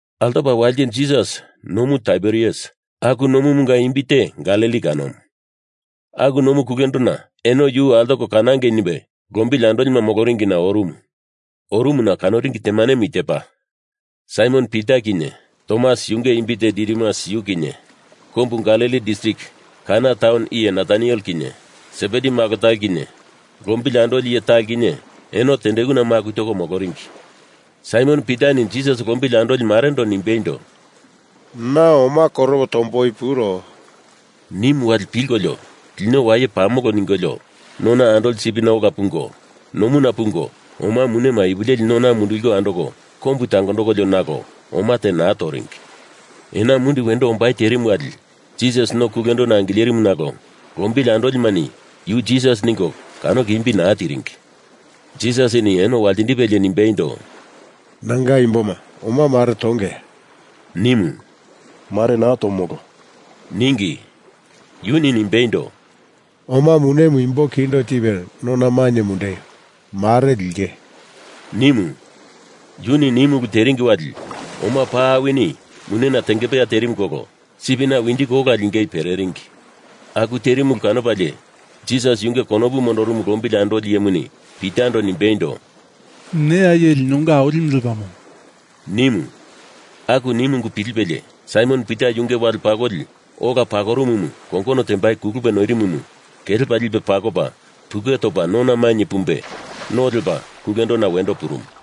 Altopa walite Jisas Nomu Taiberias aku nomumunga imbi te Galili kanomu aku nomu kulendona eno yu altoko kanangei nimbe lombili andolima moloringina orumu. Orumuna kanoringi temanemu i tepa, Saimon Pita kinye, Tomas yunge imbi te Didimus yu kinye, kombu Galili distrik Kana taun iye Nataniel kinye, Sebedi malo talo kinye, lombili andoli iye talo kinye, eno tendekuna maku toko moloringi. Saimon Pitani Jisas lombili andoli marendo nimbeindo, “Na oma koropo tomboi puro,” nimu wali pilkolio lino waye pamolo ningolio, nona andoli sipina ola pungo, nomuna pungo oma munema ipu leli nona munduliko andoko kombu tangondokolio nalo oma te naa toringi. Ena mundi wendo ombai terimu wali Jisas no kulendona angilerimu nalo lombili andolimani yu Jisas, ningo kanoko imbi naa tiringi. Jisasini eno waltindipelie nimbeindo, “Nanga imboma, oma mare tongeya?” nimu. “Mare naa tomolo,” ningi. Yuni nimbeindo, “Oma munemu imbo kindo tipe nona mainye mundeio! Mare linge,” nimu. Yuni nimu ulu teringi wali oma paa awini munena tengepeya terimu kolo sipina winjiko ola lingei pereringi. Aku terimu ulu kanopalie Jisas yunge konopu mondorumu lombili andoli iyemuni Pitando nimbeindo, “Neya iye linonga Awilimu lepamo,” nimu. Aku nimu ungu pilipelie Saimon Pita yunge wale pakoli ola pakorumumu kongono tembaindo kulupe noirimumu kelepa lipe pakopa puke topa nona mainye pumbe no lepa kulendona wendo purumu.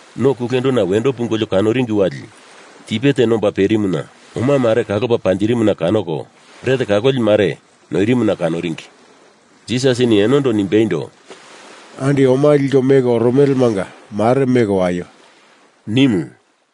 No kulendona wendo pungolio kanoringi wali tipe te nomba perimuna oma mare kalopa panjirimuna kanoko, bret kaloli mare noirimuna kanoringi. Jisasini enondo nimbeindo, “Andi oma liko meko oromelemanga mare meko waio!” nimu.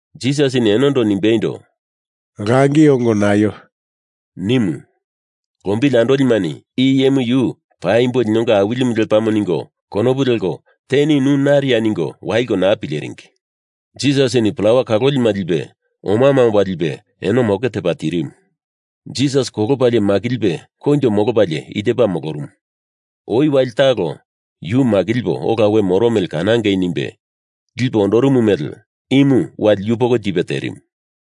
Jisasini enondo nimbeindo, “Langi ongo naio!” nimu. Lombili andolimani i iyemu yu paimbo linonga Awilimu lepamo ningo konopu leko teni nu nariya ningo waliko naa pileringi. Jisasini plawa kalolima lipe omama omba lipe eno moke tepa tirimu. Jisas kolopalie makilipe koinjo molopalie i tepa molorumu, oi wali talo yu makilipo ola we moro mele kanangei nimbe lipe ondorumu mele imu wali yupoko tipe terimu.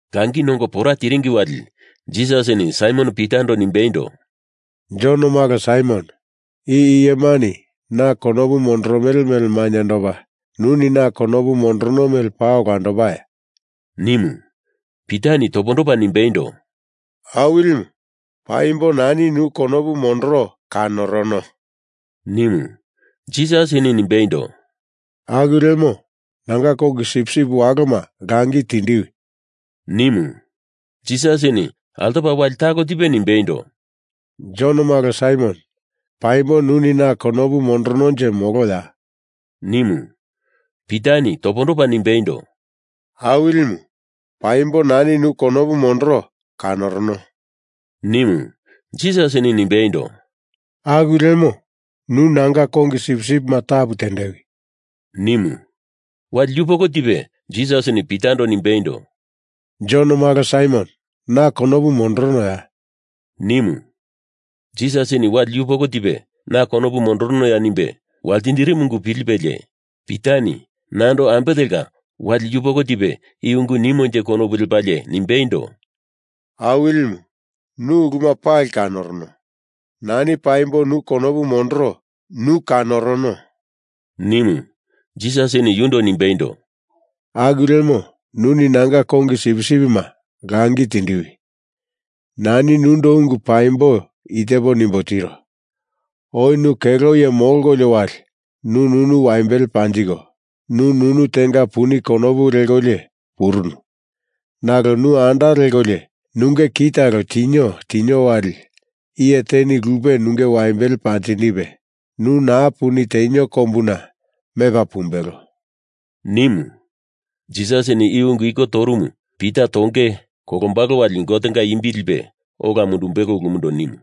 Langi nongo pora tiringi wali Jisasini Saimon Pitando nimbeindo, “Jon malo Saimon, i iyemani na konopu mondoromele mele mainyendopa, nuni na konopu mondorono mele paa olandopaya?” nimu. Pitani topondopa nimbeindo, “Awilimu, paimbo nani nu konopu mondoro kanorono,” nimu. Jisasini nimbeindo, “Aku lemo, nanga kongi sipsip waloma langi tindiwi!” nimu. Jisasini altopa wali talo tipe nimbeindo, “Jon malo Saimon, paimbo nuni na konopu mondorononje moloya?” nimu. Pitani topondopo nimbeindo, “Awilimu, paimbo nani nu konopu mondoro kanorono,” nimu. Jisasini nimbeindo, “Aku lemo, nu nanga kongi sipsipima tapu tendewi!” nimu. Wali yupoko tipe Jisasini Pitando nimbeindo, “Jon malo Saimon, na konopu mondoronoya?” nimu. Jisasini wali yupoko tipe na konopu mondoronoya nimbe waltindirimu ungu pilipelie Pitani nando ambe telka wali yupoko tipe i ungu nimonje konopu lepalie nimbeindo, “Awilimu, nu uluma pali kanorono. Nani paimbo nu konopu mondoro nu kanorono,” nimu. Jisasini yundo nimbeindo, “Aku lemo, nuni nanga kongi sipsipima langi tindiwi! Nani nundo ungu paimbo i tepo nimbo tiro. Oi nu kelo iye molkolio wali nu nunu waimbele panjiko, nu nunu tenga puni konopu lekolio purunu, nalo nu anda lekolio nunge ki talo tinio tinio wali iye teni lupe nunge waimbele panjindipe, nu naa puni tenio kombuna mepa pumbelo,” nimu. Jisasini i ungu iko torumu Pita tonge kolombalo wali Gotenga imbi lipe ola mundumbelo ulumundo nimu.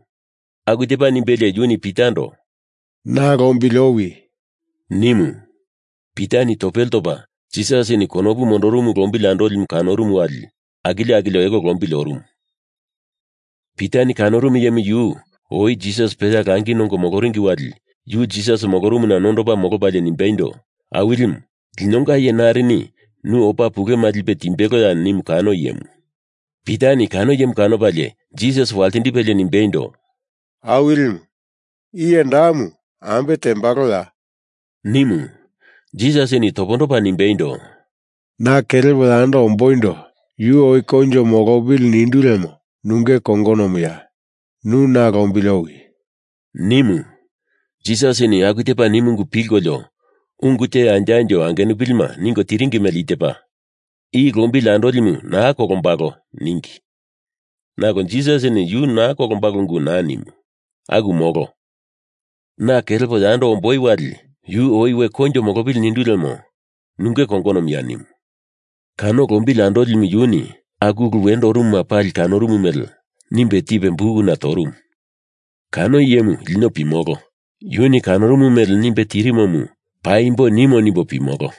Aku tepa nimbelie yuni Pitando “Na lombili owi!” nimu. Pitani topele topa Jisasini konopu mondorumu lombili andolimu kanorumu wali akilio akilio elo lombili orumu. Pitani kanorumu iyemu yu oi Jisas peya langi nongo moloringi wali yu Jisas molorumuna nondopa molopalie nimbeindo, Awilimu, linonga iye narini nu opa pulema lipe timbeloya nimu kano iyemu. Pitani kano iyemu kanopalie Jisas waltindipelie nimbeindo, “Awilimu, iye damu ambe tembaloya?” nimu. Jisasini topondopa nimbeindo, “Na kelepo yando omboindo yu oi koinjo molopili nindu lemo nunge kongonomuya? Nu na lombili owi!” nimu. Jisasini aku tepa nimu ungu pilkolio ungu te anjo anjo angenupilima ningo tiringi mele i tepa, “I lombili andolimu naa kolombalo,” ningi. Nalo Jisasini yu naa kolombalo ungu naa nimu. Aku molo. Na kelepo yando omboi wali yu oi we koinjo molopili nindu lemo nunge kongonomuya nimu. Kano lombili andolimu yuni aku ulu wendo orumuma pali kanorumu mele nimbe tipe bukuna torumu. Kano iyemu lino pimolo yuni kanorumu mele nimbe tirimomu paimbo nimo nimbo pimolo.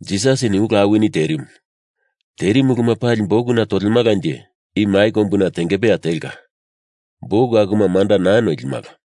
Jisasini ulu awini terimu. Terimu uluma pali bukuna tolemalanje i mai kombuna tengepeya telka buk akuma manda naa noilimala.